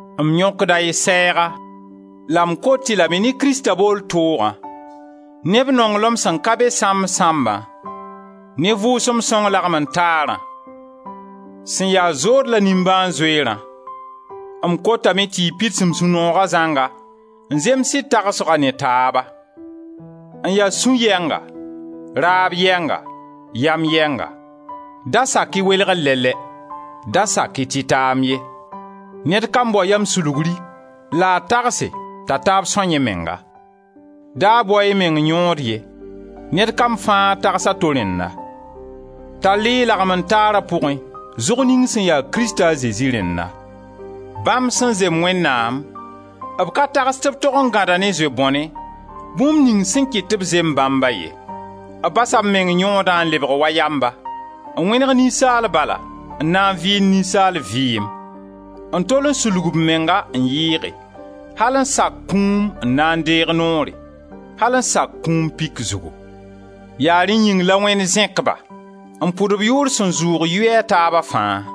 M yõkda y sɛɛga la m kot-y lame ne Krista bool toogã, ne b nonglem sẽn ka be sãmb-sãmbã, ne Vʋʋsem Sõng lagmen-taarã, sẽn ya zood la nimbãan-zoeerã, m kotame tɩ y pids m sũ-nooga zãnga n zems y tagsga ne taaba: n ya sũ-yɛnga, raab yɛnga, yam yɛnga. Da sak-y welgr lɛ-lɛ, da sak-y tɩtaam ye: ned kam bao yam-sulgri la a tagse t'a taab são yẽ menga. Da bao-y y meng yõod ye, ned kam fãa tags a to rẽnna. Tall-y y lagmen-taara pʋgẽ zʋg ning sẽn ya Krista a Zezi rẽnna. Bãmb sẽn zem Wẽnnaam, b ka tags tɩ b tog n gãda ne zoe-bõne, bũmb ning sẽn kɩt tɩ b zem bãmba ye. B basa b meng yõodã n lebg wa yamba; n wẽneg ninsaal bala, n na n vɩɩnd ninsaal vɩɩm, n tol n sulg b menga n yɩɩge al n sak kũum n na n deeg noore, al n sak kũum pik zugu! Ya rẽ yĩng la Wẽnd zẽk-ba n pʋd-b yʋʋr sẽn zʋʋg yʋy a taaba fãa.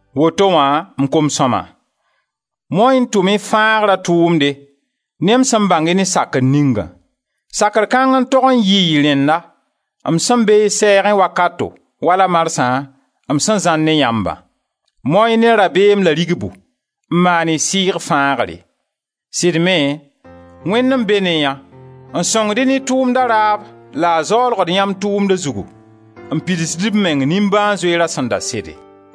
Woto wã, m kom-sõma, mao-y n tʋm y fãagra tʋʋmde ne m sẽn bãng-y ne sakr ningã. Sakr kãng n tog n yɩ y rẽnna, m sẽn be y sɛɛgẽ wakato, wala marsã, m sẽn zãr ne yãmbã. Mao-y ne rabeem la rigbu n maan y sɩɩg fãagre. Sɩd me, Wẽnd n be ne yã n sõngd-y ne tʋʋmda raab la b zaoolgd yãmb tʋmda zugu n pidsd b meng nimbãan-zoeera sẽn da sede.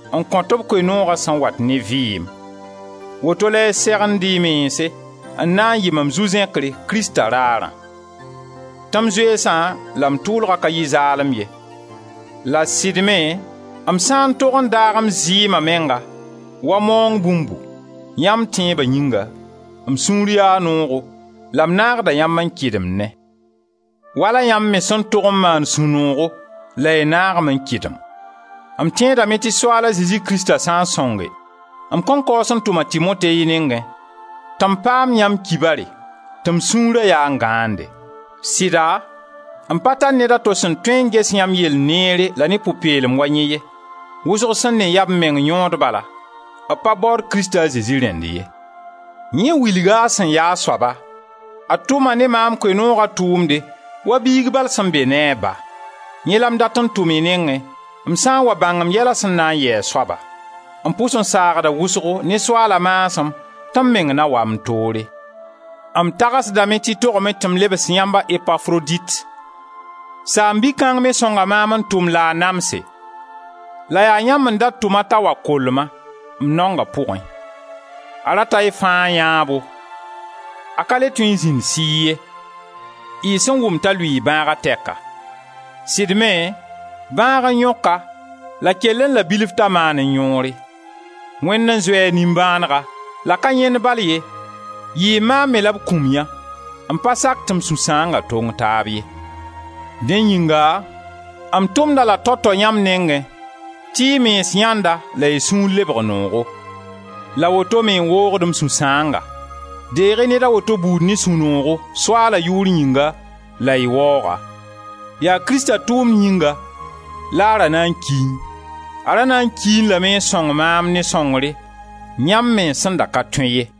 n kõt b Koe-nooga sẽn wat ne vɩɩm. Woto la y segend y mense n na n yɩ mam zu-zẽkre, Krista raarã; tɩ m zoeesa la m tʋʋlgã ka yɩ zaalem ye. La sɩd me, m sã n tog n daag m zɩɩma menga wa maoong bũmbu, yãmb tẽeba yĩnga, m sũur yaa noogo la m naagda yãmb n kɩdemne, wala yãmb me sẽn tog n maan sũ-noogo la y naag-m n kɩdem. M tẽedame tɩ Soaala Zezi Krista sã n sõnge, m kõn kaoos n tʋm a Timote y nengẽ, tɩ m paam yãmb kibare, tɩ m sũura yaa n gãande. Sɩda, m pa tar ned a to sẽn tõe n ges yãmb yell neere la ne pʋ-peelem wa yẽ ye. Wʋsg sẽn ne yaa b meng yõod bala, b pa baood Krista a Zezi rẽnd ye. Yẽ wilga a sẽn ya a soaba, a tʋma ne maam Koe-nooga tʋʋmde wa biig bal sẽn be ne a ba. Yẽ la m dat n tʋm y nengẽ, m sã n wa bãng m yɛla sẽn na n yɩ a soaba. M pʋs n saagda wʋsgo ne Soaala maasem tɩ m meng na wa m toore. M tagsdame tɩ togame tɩ m lebs yãmb a Epafrodit; saam-bi kãng me sõnga maam n tʋm la a namse la yaa yãmb n da tʋm-a t'a wa koll-ma, m naonga pʋgẽ. A rata y fãa yãabo, n ka le tõe n zĩnd sɩɩ ye, y sẽn wʋm t'a lʋɩɩ bãaga tɛka. Sɩd me bãag n yõk-a la kellẽ la bilf t'a maanẽ yõore; Wẽnd n zoe a nimbãanega, la ka yẽnd bal ye, yɩɩ maam me la b kũm yã, n pa sak tɩ m sũ-sãamsa tong taab ye. Dẽ yĩnga m tʋmd-a la tao tao yãmb nengẽ tɩ y mens yãend-a la y sũur lebg noogo; la woto-me n woogd m sũ-sãanga. Deeg-y ned a woto buudu ne sũ-noogo, Soaala yʋʋr yĩnga, la y waoog-a. Yaa Krista tʋʋmd yĩnga la a ra na n kiẽ; a ra na n kiẽ lame n sõng maam ne sõngre yãmb mens sẽn da ka tõe ye.